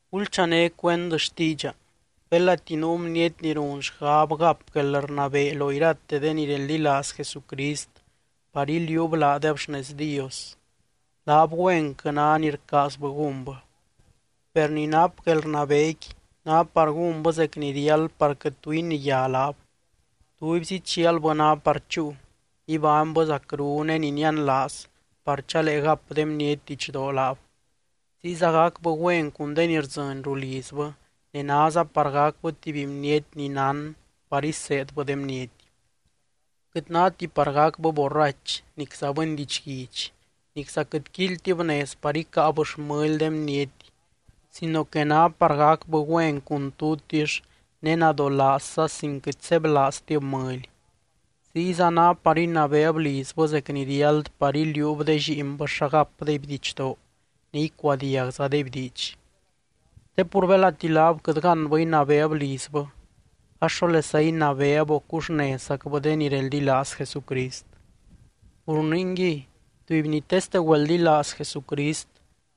Gulchané cuend xtiidxa: belati nuu bniety ni run xgab gap guelrnabee lo irate de ni reldilaaz Jesucrist par iliuub laadeb xnez Dios, laab güenquɨ ná ni rcaazbɨ gúnbɨ. Per ni nap guelrnabeequi ná par gúnbɨ zec ni riáld par quɨt tu iniyá laab. Tubyzi chialbɨ ná par chúu, ibánybɨ zacru ne ni nianlaaz par chalee gap de bniety didxdoo laab. Ziyza gacbɨ güen cun de ni rdzɨny rulizbɨ, ne náza par gacbɨ tuby bniety ni nán par iseedbɨ de bniety. Quɨt náti par gacbɨ borrach, nicza bɨny didxguidx, nicza quɨt quíilytib nez par icáab xmɨly de bniety sino que ná par gacbɨ güen cun tutix ne nadolaazza sin quɨt sebylaaztib mɨly. Ziyza ná par inabeeb lizbɨ zec ni riáld par iliuub de lliinbɨ xa gapdeby didxdoo ne icuadiagzadeby diidx. (Te pur belati laab quɨt gánbɨ inabeeb lizbɨ ax, ¿xólesa inabeeb, o cuxnezzacbɨ de ni reldilaaz Jesucrist?) Pur ningui, tuby ni teste güeldilaaz Jesucrist,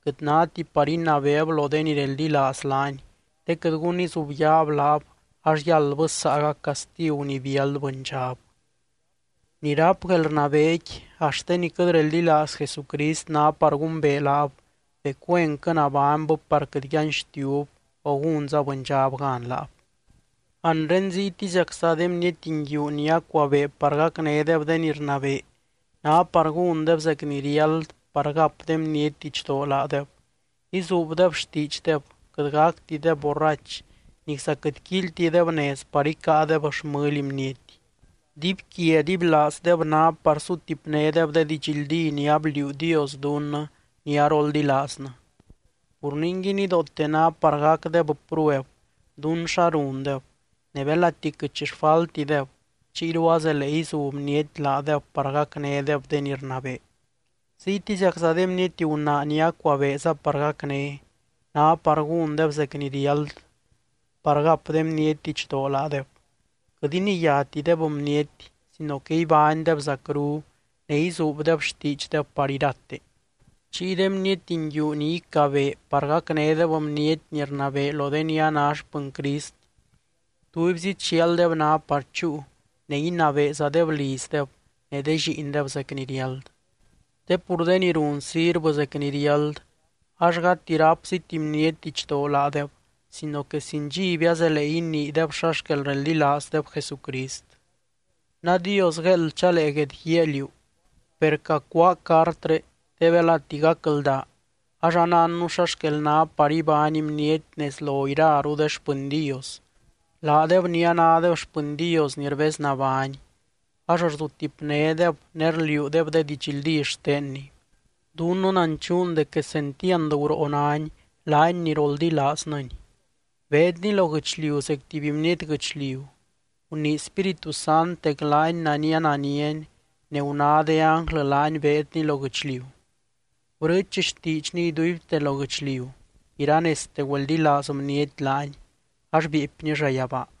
quɨt náti par inabeeb lo de ni reldilaaz laany te quɨt gun izubyaab laab ax yáldbɨ saagac castigu ni biáld bɨndxab. Ni ráp guelrnabeequi axt de ni quɨt reldilaaz Jesucrist ná par gumbee laab dec güenquɨ nabánybɨ par quɨt yanxtiub, o gúnza bɨndxab gan laab. Anre ziytiziacza de bniety nguiu ni acuabee par gacnédeb de ni rnabee, ná par gúndeb zec ni riáld par gap de bniety didxdoo laadeb, izuubdeb xtiidxdeb, quɨt gactideb borrach, nicza quɨt quíilytideb nez par icáadeb xmɨly bniety. Dibyquia dibylaazdeb ná par sutipnédeb de didxldí ni abliuu Dios dunnɨ ni aroldilaaznɨ. Pur ningui, nidoote ná par gacdeb prueb dún xa rundeb ne belati quɨt xi xfaltideb, chiyru azelee izu bniety laadeb par gacnédeb de ni rnabee. Ziytiziacza de bniety gunaa ni acuabeeza par gacné, ná par gúndeb zec ni riáld, par gap de bniety didxdoo laadeb, quɨt iniyátideb bniety sino que ibánydeb zacru ne izuubdeb xtiidxdeb par irate. Chiy de bniety nguiu ni icabee par gacnédeb bniety ni rnabee lo de ni a ná xpɨny Crist, tubyzi chialdeb ná par chúu ne inabeezadeb lizdeb ne de lliindeb zec ni riáld. Te pur de ni run sirvɨ zec ni riáld ax gati rápziti bniety didxdoo laadeb, sino que sin dxiby azelee iniideb xa xquel reldilaazdeb Jesucrist. Nadios gueeld chalee guedguíaa liú. Per cacuáa cartré te belati gacldaa ax anánnu xa xquel ná par ibány bniety nez lo iraru de xpɨny Dios, laadeb ni anádeb xpɨny Dios ni rbeznabány, ax rzutipnédeb ne rliuudeb de didxldí xtenny. Dunnɨ nanchuun dec quesentiand guroo nány, laany ni roldilaaznɨny: Beedny lo guɨchliu zec tuby bniety guɨchliu, gunii Spíritu Sant dec laany nania naniany ne guná de ánglɨ laany beedny lo guɨchliu. Brɨɨch xtiidxny iduibte lo guɨchliu, iranezte güeldilaaz bniety laany ax bieepny llayabaa.